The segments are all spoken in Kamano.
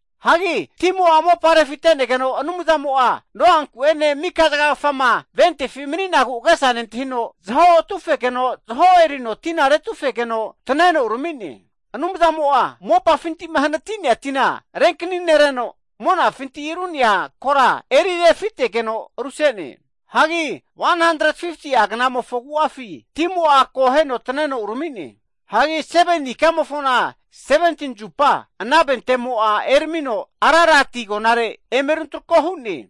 Hagi timo'a mopa refite'negeno Anumzamo'a Noanku'ene mika zagagafama ventefi mani'nagu agesa nentahino, zaho atufegeno zaho erino tina retufegeno taneno urami'ne. Anumzamo'a mopafinti'ma hanati'nea tina renkani nereno, monafinti ru'nea kora eri refitegeno ruse'ne. Hagi 150'a knamofo agu'afi timo'a akoheno taneno urami'ne. Hagi 7ni ikamofona, 17ni zupa ana ventemo'a eramino Ararati agonare eme runtrako hu'ne.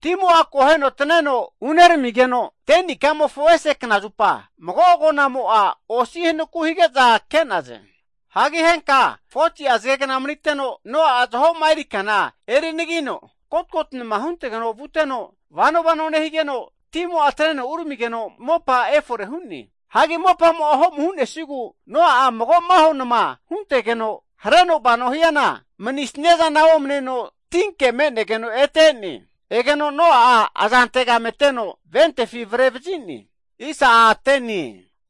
Timo'a akoheno taneno uneramigeno 10ni ikamofo ese knazupa, mago'a agonamo'za osi'a hanaku hazage'za ke'naze. Hagi henka 40'a zagegna maniteno Noa'a zaho'ma erikana eri anagino, kotikoti nama huntege vuteno, vano vano nehigeno, timo'a taneno uramigeno mopa efore hu'ne. Hagi mopamo'ma ho'mu hu'nesigu, Noa'a mago maho nama huntegeno, hareno vano hiana manisnia zana omaneno tinke me'negeno ete e'ne. Egeno Noa'a aza antegame teno ventefi avre vazi'ne.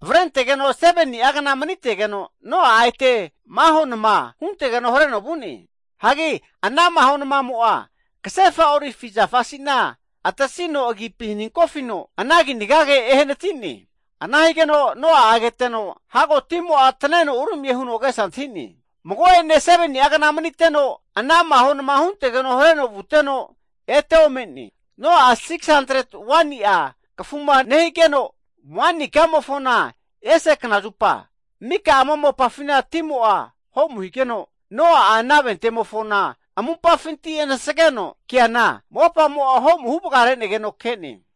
Avrentegeno 7ni'agna manitegeno, Noa'a ete maho nama huntegeno hareno vu'ne. Hagi ana maho namamo'a kasefa olivi zafa asina atasino agipi haninkofino ana kinagage ehanati'ne. Ana higeno Noa keteno, hago timo'a taneno uramie huno agesa antahi'ne. Mago'ene 7ni'agna maniteno, ana mahona huntegeno hareno vuteno ete ome'ne. Noa'a 601ni'a kafuma nehigeno, pusa ikamofona ese knazupa, mika ama mopafina timo'a ho'mu higeno, Noa'a ana ventemofona amumpafinti anasgeno keana, mopamo'a ho'mu huvagare'negeno ke'ne.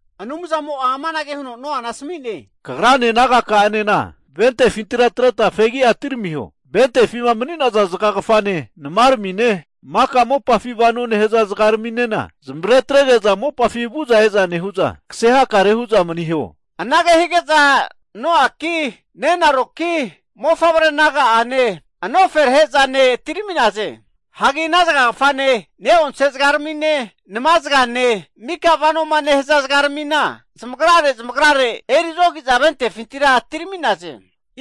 Anumzamo'a amanage huno Noana asmi'ne, kagrane nagaka'anena ventefintira atreta fegi'a atiramiho. Ventefima mani'naza zagagafane, namaramine, mika mopafi vano nehaza zagaraminena, zamavare atrege'za mopafi vu'za eza nehu'za kase hakare hu'za maniho. Anage hige'za Noaki, nenaroki, mofavre naga'ane, anoferahe'zane atirami'naze. Hagi ana zagagafane, ne'onse zagaramine, nama zagane, mika vanoma nehaza zagaramina, zamagrare zamagrare erizogi'za ventefintira atirmi'naze.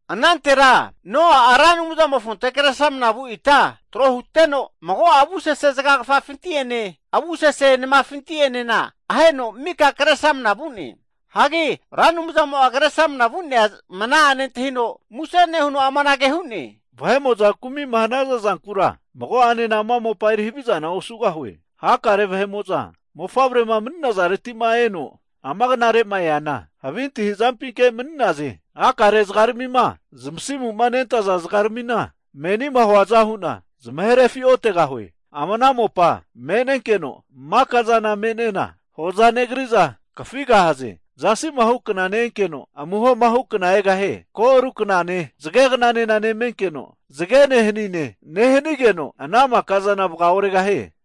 Anantera, Noa'a Ra Anumzamofonte Kresramana vu ita trohuteno, mago'a avusese zagagafafinti'ene avusese namafinti'enena aheno mika Kresramana vu'ne. Hagi Ra Anumzamo'a Kresramana vu'nea mana'a nentahino muse nehuno amanage hu'ne, vahe'mo'za kumi'ma hanaza zankura mago'anena ama mopa eri havizana osugahue. Hakare vahe'mo'za mofavrema mani'nazareti'ma eno ama knare'ma eana, havi antahi'zampinke mani'naze. Hakare zagaramima zamasimu nentaza zagaramina menima huaza hu'na zamahe refiotegahue. Ama ana mopa me'nenkeno maka'zana me'nena hoza negri'za, kafigahaze. Zasi'ma hu kna ne'enkeno, amuhoma hu kna egahie. Ko' aru knane zagegnanena nemenkeno, zagene hanine nehanigeno ana maka'zana vaga oregahie.